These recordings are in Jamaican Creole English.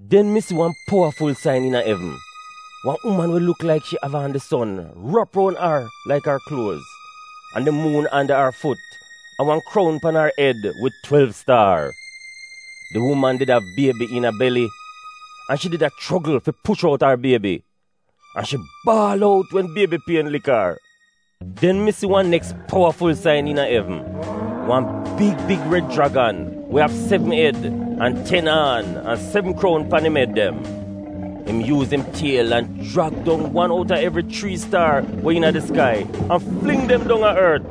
Den mi si wan powaful sain iina evn: wan uman we luk laik shi av aan di son — rap roun ar laik ar kluoz, an di muun anda ar fut an wan kroun pan ar ed wid twelv staar. Di uman did av biebi iina beli. An shi did a chogl fi push out ar Biebi. An shi baal out wen biebi pien laik ar. Den mi si wan neks powaful sain iina evn: wan big big red jragan we av sevn ed an ten aan, an sevn kroun pan im ed dem. Im yuuz im tiel an jrag dong wan outa evri chrii staar we iina di skai an fling dem dong a ort.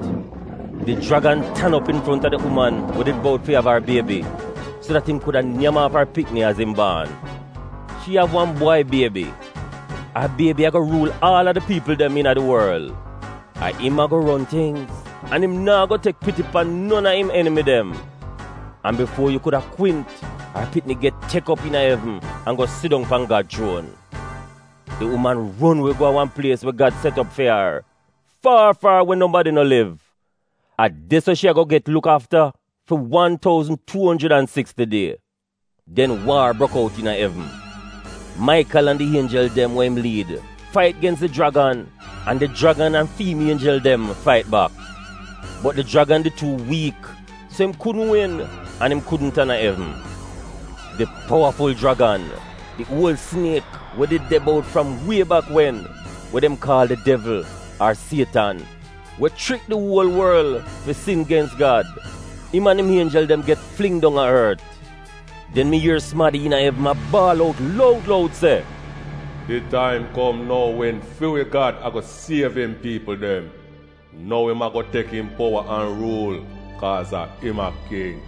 Di jragan tan op infronta di uman we did bout fi av ar biebi, so dat im kuda nyam aaf ar pikni az im baan. Shi av waan bwai biebi. Ar biebi ago ruul aal a di piipl dem iina di worl. A im ago ron tingz an im naa go tek piti pan non a im enimi dem. An bifuo yu kuda kwint, ar pikni get tek op iina evn an go sidong pan Gad chuon. Di uman ron we go a wan plies we Gad set op fi ar, faar faar we nobadi no liv. A de-so shi ago get luk aafa fi wan touzn, tuu onjrid an siksti die. Den waar brok out iina evn. Maikal an di ienjel dem we im liid fait gens di jragan an di jragan an fi im ienjel dem fait bak. Bot di jragan did tuu wiik, so im kudn win an im kudn tan a evn. Di powaful jragan — di uol siniek we did de bout fram wie bak wen, we dem kaal di devl, ar sietan, we chrik di uol worl fi sin gens Gad, im an im ienjel dem get fling dong a ort. Den mi ier sumadi iina evn a baal out loud loud se: “Di taim kom nou wen fi wi Gad ago siev im piipl dem. Nou im ago tek im powa an ruul kaaz a im a king.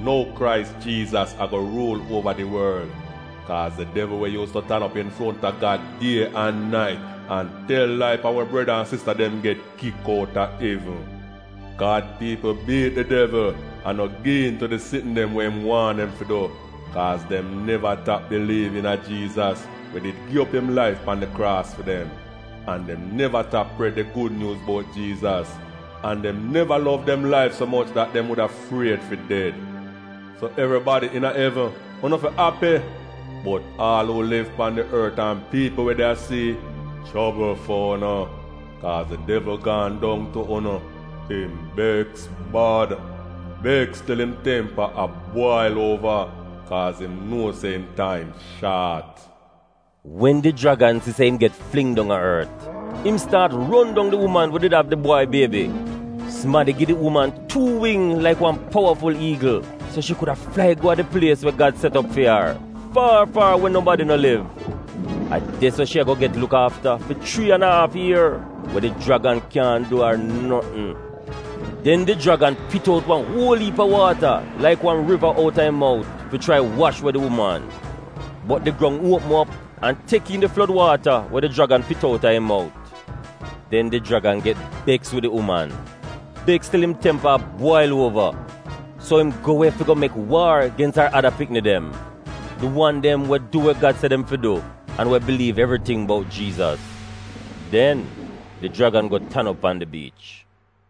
Nou Krais Jiizas ago ruul uova di worl. Kaaz di devl we yuuz tu tan op infronta Gad die an nait an tel lai pan wi breda an sista dem get kik outa evn. Gad piipl biit di devl an no gi'iin tu di sitn dem we im waahn dem fi du, kaaz dem neva tap biliiv iina Jiizas we did gi op im laif pan di kraas fi dem. An dem neva tap pred di Gud Nyuuz bout Jiizas. An dem neva lov dem laif so moch dat dem wuda fried fi ded. So evribadi iina evn, unu fi api! Bot aal uu liv pan di ort an piipl we de a sii, chobl fu'unu, kaaz di devl gaan dong tu'unu! Im beks bad — beks til im tempa a bwail uova, kaaz im nuo se im taim shaat.” Wen di jragan si se im get fling dong a ort, im staat ron dong di uman we did av di bwai biebi. Sumadi gi di uman tuu wing laik wan powaful iigl, so shi kuda flai go a di plies we Gad set op fi ar — faar faar we nobadi no liv. A de-so shi ago get luk aafa fi chrii an a aaf ier, we di jragan kyaahn du ar notn. Den di jragan pit out wan uol iip a waata, laik wan riva, outa im mout fi chrai wash we di uman. Bot di grong uopm op an tek iin di flod waata we di jragan pit outa im mout. Den di jragan get beks wid di uman — beks til im tempa a bwail uova. So im go we fi go mek waar gens ar ada pikni dem — di wan dem we du we Gad se dem fi du, an we biliiv evriting bout Jiizas. Den di jragan go tan op pan di biich.